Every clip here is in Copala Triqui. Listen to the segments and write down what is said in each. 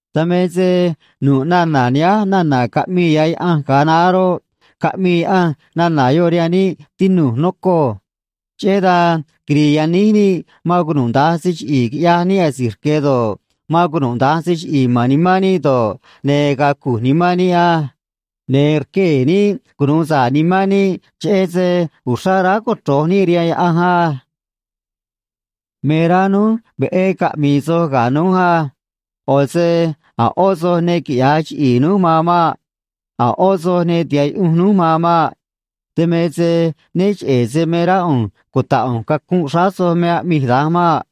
Dan me se nu̱ꞌ nana̱ nihánj nana̱ caꞌmii ya̱ Yaꞌanj ga̱a naá roꞌ, caꞌmii Yaꞌanj nana̱ yoꞌ rihaan níꞌ, tinu̱j, nocoj. Cheꞌé dan quiri̱i̱ yaníj níꞌ man cunuda̱nj se chiꞌi̱i̱ quiꞌyaj níꞌ asi̱j rque̱ do̱ꞌ, man cunuda̱nj se chiꞌi̱i̱ ma̱n nimán níꞌ do̱ꞌ, ne̱ ga̱a̱ cu̱j nimán níꞌ á. Ne̱ rquee̱ níꞌ cunu̱u sa̱ꞌ nimán níꞌ, cheꞌé se uxrá aráj cochro̱j níꞌ rihaan Yaꞌanj á. Me rá núj veꞌé caꞌmi̱i̱ soj ga̱ núj á. ꞌO̱ se a̱ ꞌó soj ne quiꞌya̱j chiꞌi̱i̱ núj man maꞌ. A̱ ꞌó soj ne tiha̱ꞌ yuꞌunj núj man maꞌ. Dan me se né cheꞌe̱ se me rá ꞌu̱nj cuta̱ꞌ ꞌu̱nj cacunꞌ xráá soj me aꞌmij da̱nj maꞌ.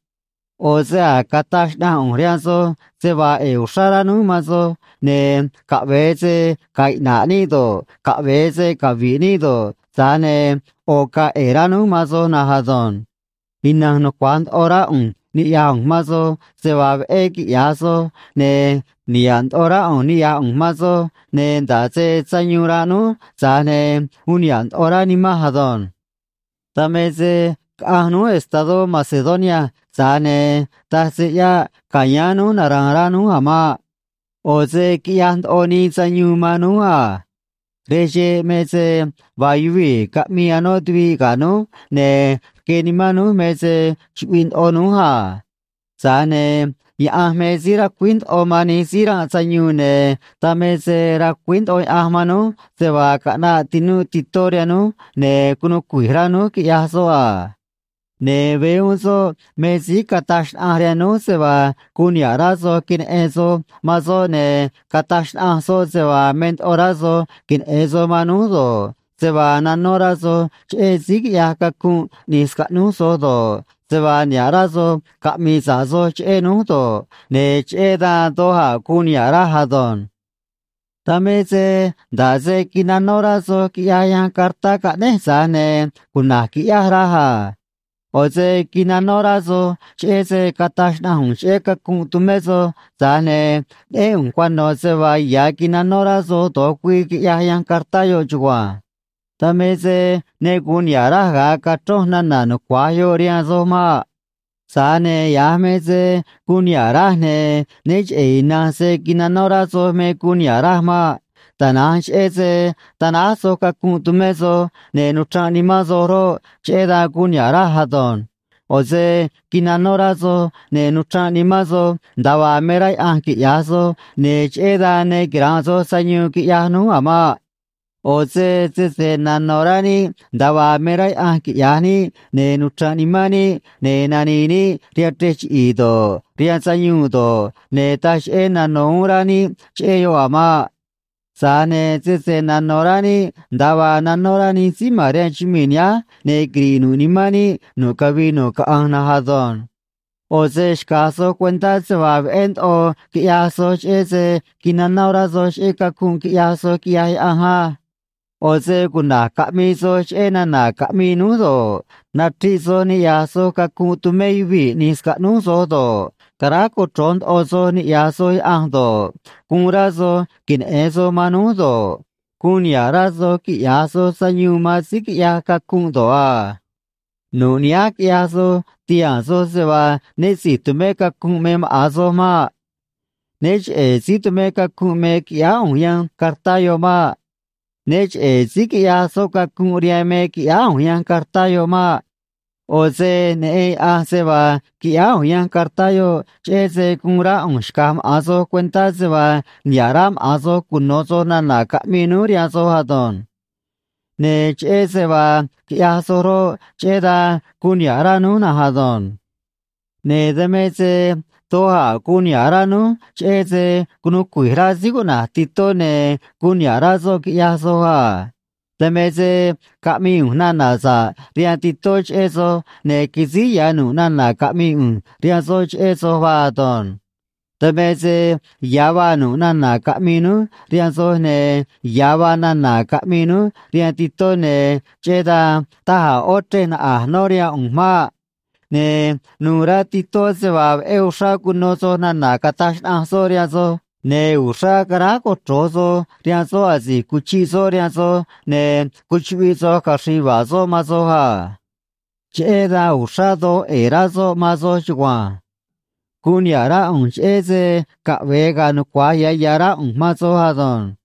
ꞌO̱ se a̱j cataj xnaꞌanj ꞌu̱nj rihaan soj se vaa ꞌe̱e̱ uxrá rá núj man soj, ne̱ caꞌve̱e se ga̱a̱ iꞌna̱ꞌ níꞌ do̱ꞌ, caꞌve̱e se cavi̱ꞌ níꞌ do̱ꞌ, tza̱j ne̱ ꞌo̱ ga̱a̱ ꞌe̱e̱ rá núj man soj na̱nj ado̱nj. Ina̱nj nucua̱j ndoꞌo rá ꞌu̱nj niꞌya̱j ꞌu̱nj man soj se vaa veꞌé quiꞌya̱j soj, ne̱ niha̱ꞌ ndoꞌo rá ꞌu̱nj niꞌya̱j ꞌu̱nj man soj, ne̱ nda̱ꞌ se sayuun ranꞌ núj, tza̱j ne̱ uun niha̱ꞌ ndoꞌo rá nimanj ado̱nj. Dan me se caꞌanj núj estadó Macedonia, tza̱j ne̱ taj se ꞌyáꞌ ca̱yáán núj nara̱a̱n rá núj a̱ maꞌ. ꞌO̱ se quiꞌyaj ndoꞌo nii sayuun man núj a. Rej xeꞌ me se vaa yuvii̱ caꞌmii anó tuviꞌ ga̱ núj, ne̱ rque nimán núj me se chuꞌviꞌ ndoꞌo núj a. Tza̱j ne̱ Yaꞌanj me síí racuíj ndoꞌo man nij síí ranꞌ sayuun, ne̱ dan me se racuíj ndoꞌo Yaꞌanj man núj se vaa caꞌnaꞌ tinúꞌ Titó rihaan núj, ne̱ cunuu cui̱j rá núj, quiꞌyaj soꞌ a. Ne̱ veé uún soꞌ me síí cataj xnaꞌanj rihaan núj se vaa guun niha̱ꞌ rá soꞌ queneꞌen soꞌ man soj, ne̱ cataj xnaꞌanj soꞌ se vaa me ndoꞌo rá soj queneꞌe̱n soj man núj do̱ꞌ, se vaa nanó rá soj cheꞌé síí quiꞌyaj cacunꞌ ꞌni̱j scaꞌnúj soj do̱ꞌ, se vaa niha̱ꞌ rá soj caꞌmi̱i̱ sa̱ꞌ soj cheꞌé núj do̱ꞌ, ne̱ cheꞌé dan doj a̱ guun niha̱ꞌ raj ado̱nj. Dan me se nda̱ꞌ se quinanó rá soj, quiꞌyaj yanj cartá caꞌnéj, tza̱j ne̱ cuna̱j quiꞌyáj, raj a. ꞌO̱ se quinanó rá soj cheꞌé se cataj xnaꞌanj ꞌu̱nj cheꞌé cacunꞌ tumé soj, tza̱j ne̱ neꞌén ꞌu̱nj cuano̱ se vaa ya̱ quinanó rá soj do̱j güii, quiꞌyaj yanj cartá yoꞌ chugua̱nj. Dan me se ne gu̱un niha̱ꞌ raj ga̱a cachronj nana̱ nucua̱j yoꞌ rihaan soj maꞌ. Tza̱j ne̱ ya̱j me se guun niha̱ꞌ raj, ne̱ né cheꞌe̱ ina̱nj se quinanó rá soj me guun niha̱ꞌ raj maꞌ. Tana̱nj cheꞌé se tanáj soj cacunꞌ tumé soj, ne̱ nuchranꞌ nimán soj roꞌ, cheꞌé dan guun niha̱ꞌ raj ado̱nj. ꞌO̱ se quinanó rá soj, ne̱ nuchranꞌ nimán soj nda̱a vaa me rá Yaꞌanj quiꞌya̱j soj, ne̱ cheꞌé dan ne quira̱nꞌ soj sayuun, quiꞌyaj núj a̱ maꞌ. ꞌO̱ se sese nano̱ rá níꞌ nda̱a vaa me rá Yaꞌanj quiꞌya̱j níꞌ, ne̱ nuchra̱nꞌ nimán níꞌ, ne̱ nani̱i̱ níꞌ rihaan chrej chiꞌi̱i̱ do̱ꞌ, rihaan sayuun do̱ꞌ, ne̱ taj cheꞌé nano̱ uún rá níꞌ cheꞌé yoꞌ a̱ maꞌ. Tza̱j ne̱ sese nano̱ rá níꞌ nda̱a vaa nanó rá nij síí ma̱n rihaan chumii̱ nihánj, ne̱ quiri̱ꞌ nu̱ꞌ nimán níꞌ nu̱ꞌ cavii nu̱ꞌ caꞌanj na̱nj ado̱nj. ꞌO̱ se xca̱j soj cuentá se vaa veꞌé ndoꞌo quiꞌyaj soj, cheꞌé se quinanó rá soj cheꞌé cacunꞌ quiꞌyaj soj, quiꞌyaj Yaꞌanj á. ꞌO̱ se cuna̱j caꞌmii soj cheꞌé nana̱ caꞌmii núj do̱ꞌ, nachriꞌ soj niꞌya̱j soj cacunꞌ tumé yuvii̱ ꞌni̱j scaꞌnúj soj do̱ꞌ, caráj cochro̱j ndoꞌo soj niꞌya̱j soj Yaꞌanj do̱ꞌ, guun rá soj queneꞌe̱n soj man núj do̱ꞌ, guun niha̱ꞌ rá soj quiꞌya̱j soj sayuun man síí quiꞌyaj cacunꞌ do̱ꞌ a. Nu̱ꞌ nihánj quiꞌyaj soj, tihaa̱n soj se vaa né si̱j tumé cacunꞌ me maꞌa̱n soj maꞌ. Né cheꞌe̱ síí tumé cacunꞌ me quiꞌyáá ꞌu̱nj yanj cartá yoꞌ maꞌ. Né cheꞌe̱ síí quiꞌyaj soꞌ cacunꞌ rihaan me quiꞌyáá ꞌu̱nj yanj cartá yoꞌ maꞌ. ꞌO̱ se neꞌen Yaꞌanj se vaa quiꞌyáá ꞌu̱nj yanj cartá yoꞌ cheꞌé se guun rá ꞌu̱nj xca̱j maꞌa̱n soj cuentá se vaa niha̱ꞌ rá maꞌa̱n soj cuno̱ soj nana̱ caꞌmii núj rihaan soj ado̱nj. Ne̱ cheꞌé se vaa quiꞌyaj soj roꞌ, cheꞌé dan guun niha̱ꞌ rá núj na̱nj ado̱nj. Ne̱ dan me se doj a̱ guun niha̱ꞌ rá núj cheꞌé se cunuu cui̱j rá síí cuꞌna̱j Titó ne̱ guun niha̱ꞌ rá soꞌ, quiꞌyaj soj a. Dan me se caꞌmii ꞌu̱nj nana̱ sa̱ꞌ rihaan Titó cheꞌé soj, ne̱ quisíj ya̱ nu̱ꞌ nana̱ caꞌmii ꞌu̱nj rihaan soꞌ cheꞌé soj vaa ado̱nj. Dan me se ya̱ vaa nu̱ꞌ nana̱ caꞌmii núj rihaan soj, ne̱ ya̱ vaa nana̱ caꞌmii núj rihaan Titó, ne̱ cheꞌé dan taj a̱ ꞌó chrej naꞌa̱j nó rihaan ꞌu̱nj maꞌ. Ne̱ nu̱u̱ rá Titó se vaa veꞌé uxrá cuno soj nana̱ cataj xnaꞌanj soꞌ rihaan soj, ne̱ uxrá caráj cochro̱j soj rihaan soꞌ asi̱j cuchiꞌ soꞌ rihaan soj, ne̱ cuchuꞌviꞌ soj caxri̱i̱ yuva̱a̱ soꞌ man soj a. Cheꞌé dan uxrá doj ꞌe̱e̱ rá soꞌ man soj chugua̱nj. Guun niha̱ꞌ rá ꞌu̱nj, cheꞌé se caꞌve̱e ga̱a̱ nucua̱j ya̱ ya̱ rá ꞌu̱nj man soj ado̱nj.